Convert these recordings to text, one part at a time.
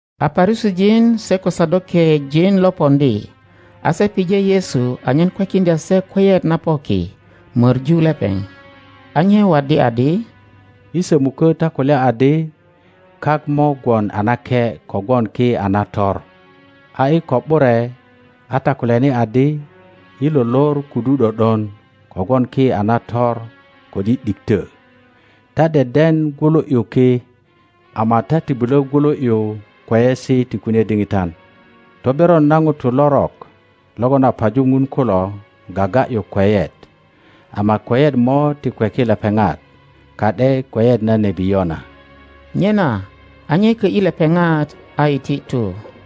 A Parusijin se ko Sadokejin lopoŋdi, a se pije Yesu anyen kwekiŋdya se kweyet na po ki, möŋu lepeŋ. A nye waddi adi, I sömukö ta kulya adi, Kak mo gwon a nake kogwon ki a nator. A i ko ’bure a ta kulyani adi, I lo lor kudu ’do ’don, kogwon ki a nator ko ’di ’dikto. Ta deden gwulu ’yu ki, ama ta ti bulö gwulu ’yu kweyesi ti kune diŋitan. Toberon na ŋutu lorok logon a paju Ŋun kulo gaga ’yu kweyet, ama kweyet mo ti kweki lepeŋat, ka ’de kweyet na nebi Yona. Nyena a nye kö ’yi lepeŋat a iti tu.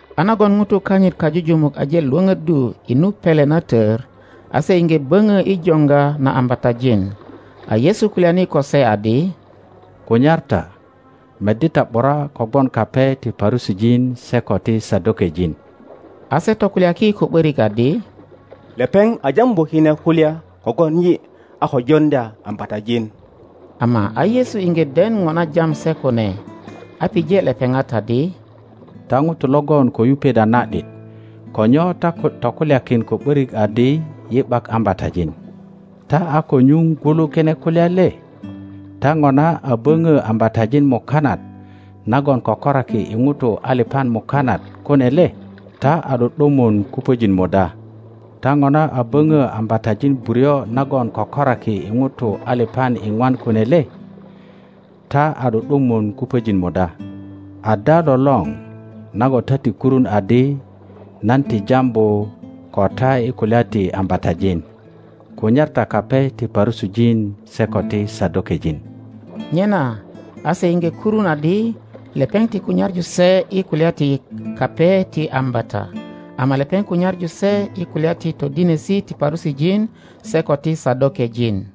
A nagon ŋutu kanyit kajujumuk aje lwöpöddu i nu pele na tör, a se iŋge böŋo i joŋga na ambatajin. A Yesu kulyani ko se adi, Kunyar ta, meddi ta ’bura kogwon kape ti Parusijin se ko ti Sadokejin. A se tokulyaki ko ’börik adi, Lepeŋ a jambu kine kulya kogwon yi a ko joŋdya ambatajin. Ama a Yesu iŋge den ŋo na jam se kune, a pije lepeŋat adi, Ta ŋutu logon ko yupet a na ’dit, ko nyo ta tokulyakin ko ’börik adi, Yi ’bak ambatajin? Ta a ko nyuŋ gwulu kine kulya le? Ta ŋona a böŋö ambatajin mukanat nagon kokoraki i ŋutu alipan mukanat kune le? Ta a ’du ’dumun kupöjin muda? Ta ŋona a böŋö ambatajin buryo nagon kökoraki i ŋutu alipan iŋwan kune le? Ta a ’du ’dumun kupöjin muda? Ada lolöŋ nagon ta ti kurun adi nan ti jambu ko ta i kulya ti ambatajin? Kunyar ta kape ti Parusijin se ko ti Sadokejin. Nyena a se iŋge kurun adi lepeŋ ti kunyaŋu se i kulya ti kape ti ambata, ama lepeŋ kunyaŋu se i kulya ti todinesi ti Parusijin se ko ti Sadokejin.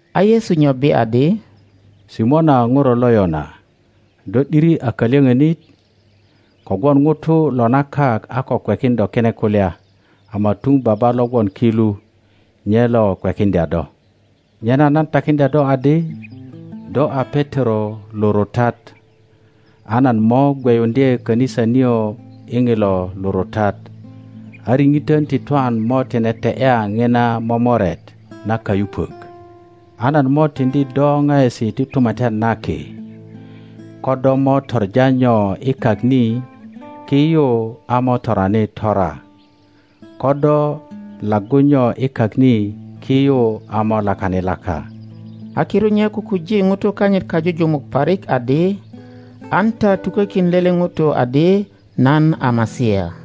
a Yesu nyobbi adi, Simona ŋuro lo Yona, do ’diri a kalyöŋönit! Kogwon ŋuto lo na kak a ko kwekin do kine kulya, ama tuŋ Baba lo gwon ki lu nye lo kwekiŋdya do. Nyena nan takiŋdya do adi, Do a Petero lurutat, a nan mo gweyuŋdye kanisa nio i ŋilo lurutat, a riŋitön ti twan mo tine te ’ya ŋina momoret na kayupok. a nan mo tiŋdi do ŋaesi ti Tumatyan na Ki, ko do mo toŋa nyo i kak ni, ki yu a mo torani tora, ko do laggu nyo i kak ni, ki yu a mo lakani laka. a kirut nye kukuji ŋutu kanyit kajujumuk parik adi, An ta tukökin lele ŋuto adi nan a Masia.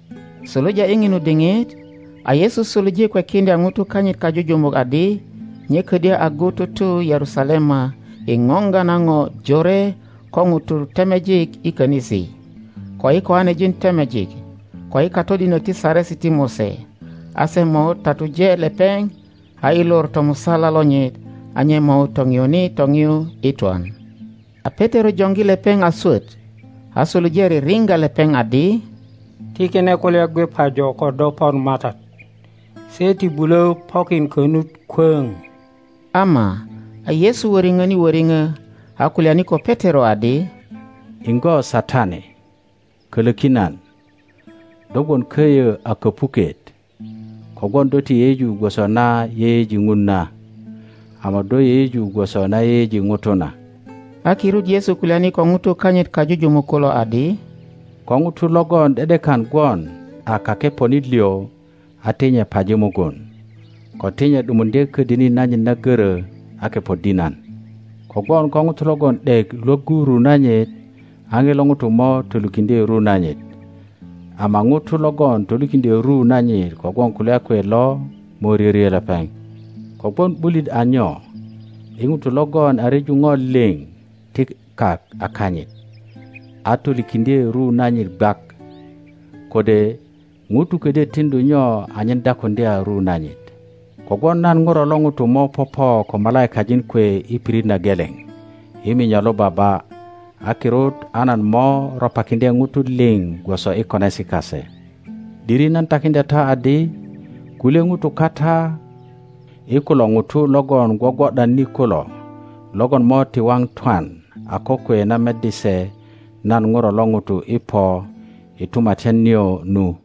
Suluja i ŋinu diŋit, a Yesu suluje kwekiŋdya ŋutu kanyit kajujumuk adi nye ködyö agu tutu Yerusalema i ŋoŋga na ŋo jore ko ŋutu temejik i könisi, ko i kiŋanejin temejik, ko i katodinok ti Saresi ti Mose, a se mo tatuje lepeŋ, a i lor tomusala lonyit a nye mo toŋiyuni toŋiyu i twan. a Petero joŋgi lepeŋ a swöt, a suluje ririŋga lepeŋ adi, Ti kine kulya gwe pajo ko do pon MATAT! Se ti bulö pokin konut kwöŋ. Ama a Yesu wöriŋöni wöriŋö, a kulyani ko Petero adi, Iŋgo Satani, kölöki nan! Do gwon köyö a kopuket, kogwon do ti yeyeju gwoso na yeyeji Ŋun na, ama do yeyeju gwoso na yeyeji ŋutu na. A kirut Yesu kulyani ko ŋutu kanyit kajujumuk kulo adi, Ko ŋuto logon ’de ’dekan gwon a kakeponit liŋ a ti nye paji mugun, ko ti nye ’dumuŋdye ködini nanyit na görö a kepoddi nan. Kogwon ko ŋuto logon ’dek Iwoggu ru nanyit, a ŋilo ŋuto mo tolikiŋdye ru nanyit, ama ŋuto logon tolikiŋdyö ru nanyit kogwon kulya kwe lo mo ryoryo lepeŋ. Kogwon ’bulit a nyo i ŋuto logon a ryeju ŋo liŋ ti kak a kanyit, a tolikiŋdye ru nanyit gwak? Kode ŋuto ködyö tiŋdu nyo anyen dakuŋdya ru nanyit? Kogwon nan Ŋuro lo ŋuto mo popo ko malaikajin kwe i pirit na geleŋ i minyo lo Baba, a kirut a nan mo ropakiŋdye ŋutu liŋ gwoso i konesi kase. ’Diri nan takiŋdya ta adi, Kulye ŋutu kata i kulo ŋutu logon gwogwo ’dan ni kulo, logon mo ti waŋ twan a kokwe na meddi se nan Ŋuro lo ŋuto i po i tumatyan nio nu.